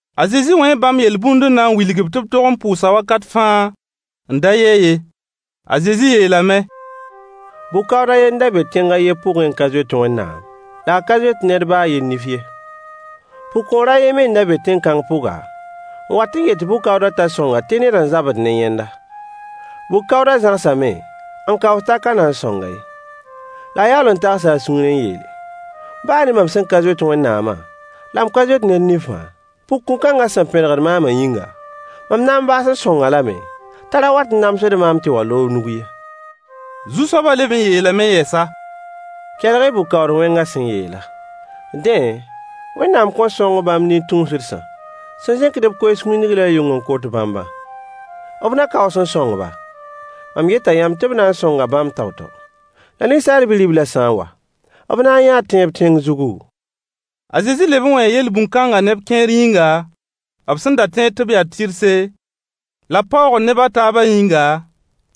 A Zezi wẽe bãmb yel-bũnd n na n wilg-b tɩ b tog n pʋʋsa wakat fãa n da yɛ ye. A Zezi yeelame: Bʋ-kaood a ye n da be tẽng a yen pʋgẽ n ka zoet Wẽnnaam, la a ka zoet ned baa a yen nif ye. Pʋgkõor a ye me n da be tẽn-kãng pʋga, n wat n yet bʋ-kaoodã t'a sõng-a tɩ ned n zabd ne yẽnda. Bʋ-kaoodã zãgsame n kaoos t'a ka na n sõng-a ye. La a yaool n tagsa a sũurẽ n yeele: “Baa ne mam sẽn ka zoet Wẽnnaama, la m ka zoet ned nifã, pʋgkõ-kãngã sẽn pẽdgd maama yĩnga, mam na n baas n sõng-a lame t'a ra wat n namsd maam tɩ wa n loog nug ye.” Zu-soabã leb n yeelame yɛsa: Kelg-y bʋ-kaood-wẽngã sẽn yeelã. Dẽ, Wẽnnaam kõn sõng bãmb nin-tũusdsã sẽn zẽkd b koees wĩndg la yʋng n kot bãmbã? B na kaoos n sõng-ba? Mam yeta yãmb tɩ b na n sõnga bãmb tao-tao. La Ninsaal Bi-riblã sã n wa, b na n yãa tẽeb tẽng zugu? A Zezi leb n wẽe yel-bũn-kãnga neb kẽer yĩnga, b sẽn da tẽed tɩ b yaa tɩrse, la b paoogd neb a taabã yĩnga,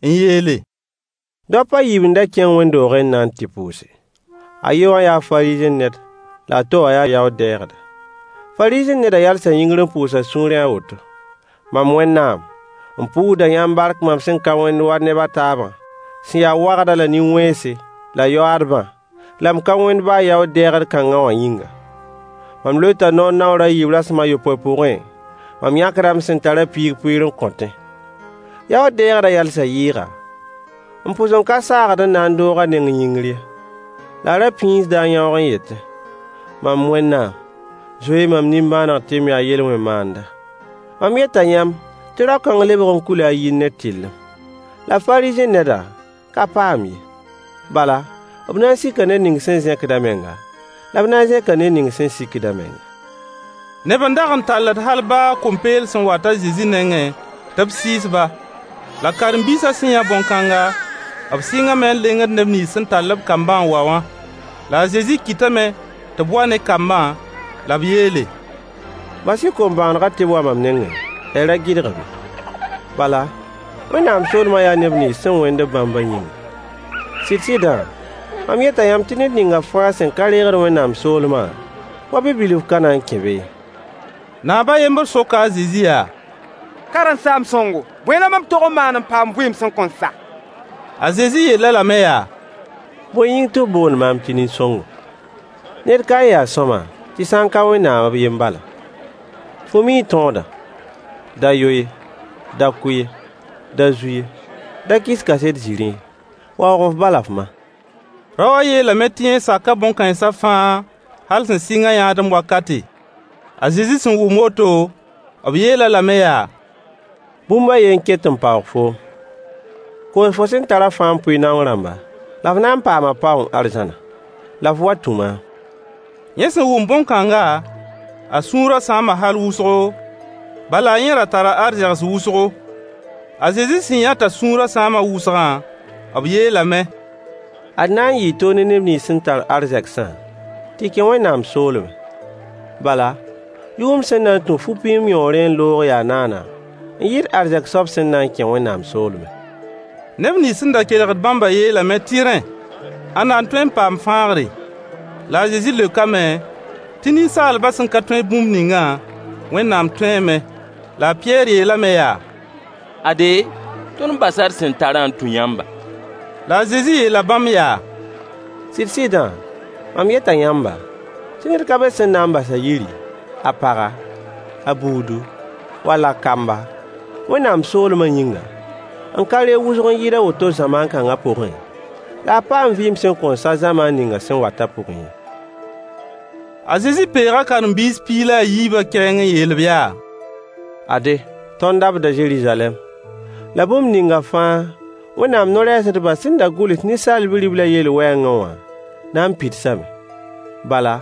n yeele: Daop a yiib n da kẽng wẽnd-doogẽ n na n tɩ pʋʋse. A ye wã yaa Fariisẽ ned la a to wã yaa yaood-dɛɛgda. Fariisẽ nedã yalsa yĩngr n pʋʋs a sũurẽ a woto: “Mam Wẽnnaam, m pʋʋsda yãmb bark mam sẽn ka wẽnd wa neb a taabã sẽn ya wagda la nin-wẽnse la yoaadbã, la m ka wẽnd baa yaood-deegd-kãnga wã yĩnga. Mam loeta noor naoor a yiib rasem a yopoe pʋgẽ, mam yãkda m sẽn tarã piig pʋɩɩr n kõtẽ.” Yaood-dɛɛgdã yalsa yɩɩga, n pʋs n ka saagd n na n doog a neng yĩngr ye. La a ra pĩisda a yãoog n yetẽ: “Mam Wẽnnaam! Zoe-y mam nimbãaneg tɩ m yaa yel-wẽn-maanda.” Mam yeta yãmb tɩ rao-kãng lebg n kuila a yir ne tɩrlem. La fariisẽ nedã ka paam ye. Bala, b na n sika ned ning sẽn zẽkd a menga, la b na zẽka ned ning sẽn sikd a menga. Neb n dag n talled hal baa kom-peels n wat a Zezi nengẽ tɩ b sɩɩs-ba. La karen-biisã sẽn yã bõn-kãnga, b sɩngame n lengd neb nins sẽn tall-b kambã n wa wã. La a Zezi kɩtame tɩ b wa ne kambã, la b yeele: Bas-y kom-bõonegã tɩ b wa mam nengẽ la y ra gɩdg-b ye. Bala, Wẽnnaam soolmã yaa neb nins sẽn wẽnd-b bãmbã yĩnga. Sɩd-sɩdã, mam yeta yãmb tɩ ned ning fãa sẽn ka reegd Wẽnnaam soolmã wa bi-bilf ka na kẽ be ye. Naab a yembr soka a Zezi yaa: Karen-saam-sõngo, bõe la mam tog n maan n paam vɩɩm sẽn kõn sa? A Zezi yeel-a lame yaa: Bõe yĩng tɩ f boond maam tɩ nin-sõngo? Ned kae n ya sõama tɩ sã n ka Wẽnnaam b yen bala. Fo mii tõodã: “Da yo ye, da kʋ ye, da zu ye, da kɩs kaset zĩrĩ ye, waoog f ba la f ma.” Rao wã yeelame tɩ yẽ saka bõn-kãensã fãa hal sẽn sɩng a yãadem wakate. A Zezi sẽn wʋm woto, b yeel-a lame yaa: Bũmb a ye n ket n paoog foom. Koos fo sẽn tarã fãa n pʋɩ naong rãmba la f na n paama paoong arzãna. La f wa tũ maam. Yẽ sẽn wʋm bõn-kãnga, a sũurã sãama hal wʋsgo, bala yẽ ra tara arzegs wʋsgo. A Zezi sẽn yã [t'a sũurã sãama wʋsgã], b yeelame: Ad na n yɩɩ toog ne neb nins sẽn tar arzegsã tɩ kẽ Wẽnnaam soolmẽ. Bala, yʋgemd sẽn na n tũ fu-pĩim yõorẽ n loog yaa naana n yɩɩd arzɛk soab sẽn na n kẽ Wẽnnaam soolmẽ. Neb nins sẽn da kelgd bãmbã yeelame tɩ rẽ, ãnna n tõe n paam fãagre. La a Zezi leokame tɩ ninsaalbã sẽn ka tõe bũmb ningã, Wẽnnaam tõeeme. La a Pɩyɛɛr yeelame yaa: Ade, tõnd basa d sẽn tarã n tũ yãmba. La a Zezi yeela bãmb yaa: Sɩd-sɩdã, mam yeta yãmba, tɩ ned ka be sẽn na n bas a yiri, a paga, a buudu, wall a kamba, Wẽnnaam soolmã yĩnga, n ka reeg wʋsg n yɩɩd a woto zamaan kãnga pʋgẽ, la a paam vɩɩm sẽn kõn sa zamaan ninga sẽn watã pʋgẽ ye. A Zezi peega karen-biis piig la yiibã kɛɛng n yeel-b yaa: Ade, tõnd dabda Zeruzalɛm, la bũmb ninga fãa Wẽnnaam no-rɛɛsdbã sẽn da gʋls Ninsaal Bi-riblã yell wɛɛngẽ wã na n pidsame. Bala,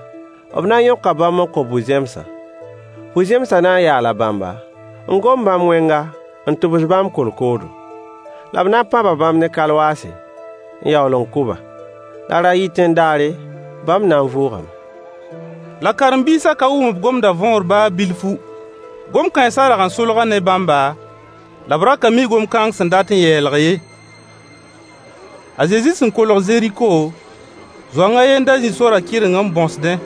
b na n yõka bãmb n kõ bu-zẽmsã. Bu-zẽmsã na n yaala bãmba, n gom bãmb wẽnga n tʋbs bãmb kolkoodo. La b na n pãba bãmb ne kalwaase n yaool n kʋ-ba. La ra-tãtẽ-daare bãmb na n vʋʋgame. La karen-biisa ka wʋm b gomda võor baa bilfu. Gom-kãensa rag n solga ne bãmba, la b ra ka mi gom kãng sẽn dat n yɛɛlg ye. A Zezi sẽn kolg Zeriko, zoang a ye n da zĩ sorã kɩreng n bõsdẽ.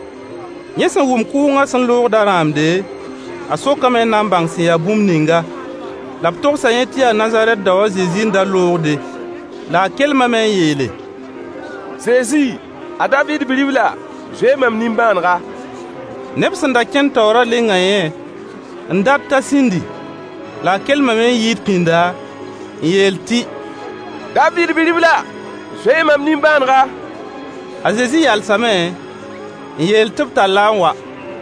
Yẽ wʋma kʋʋngã sẽn loogdã rãamde, a sokame n na n bãng sẽn ya bũmb ninga. La b togsa yẽ tɩ yaa Nazarɛt dao a Zezi n da loogde. La a kelmame n yeele: Zezi, a Daviid Bi-ribla, zoe-y mam nimbãanega! Neb sẽn da kẽnd taoorã lenga yẽ n dat t'a sĩndi. La a kelmame n yɩɩd pĩnda n yeel tɩ: Daviid bi-ribla, zoe-y mam nimbãanega. A Zezi yalsame n yeel tɩ b tall-a n wa.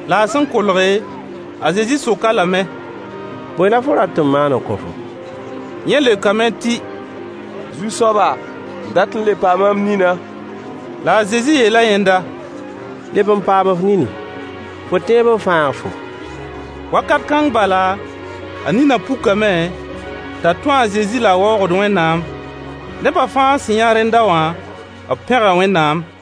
La a sẽn kolge, a Zezi sok-a lame: Bõe la fo rat tɩ m maan n kõ-fo? Yẽ leokame tɩ: Zu-soaba, m dat n le paama m ninã. La a Zezi yeela yẽnda: Leb n paam f nini. Fo tẽeb n fãag-fo. Wakat kãng bala, a ninã pukame t'a tũ a Zezi la a waoogd Wẽnnaam. Neba fãa sẽn yã rẽnda wã, b pẽga Wẽnnaam.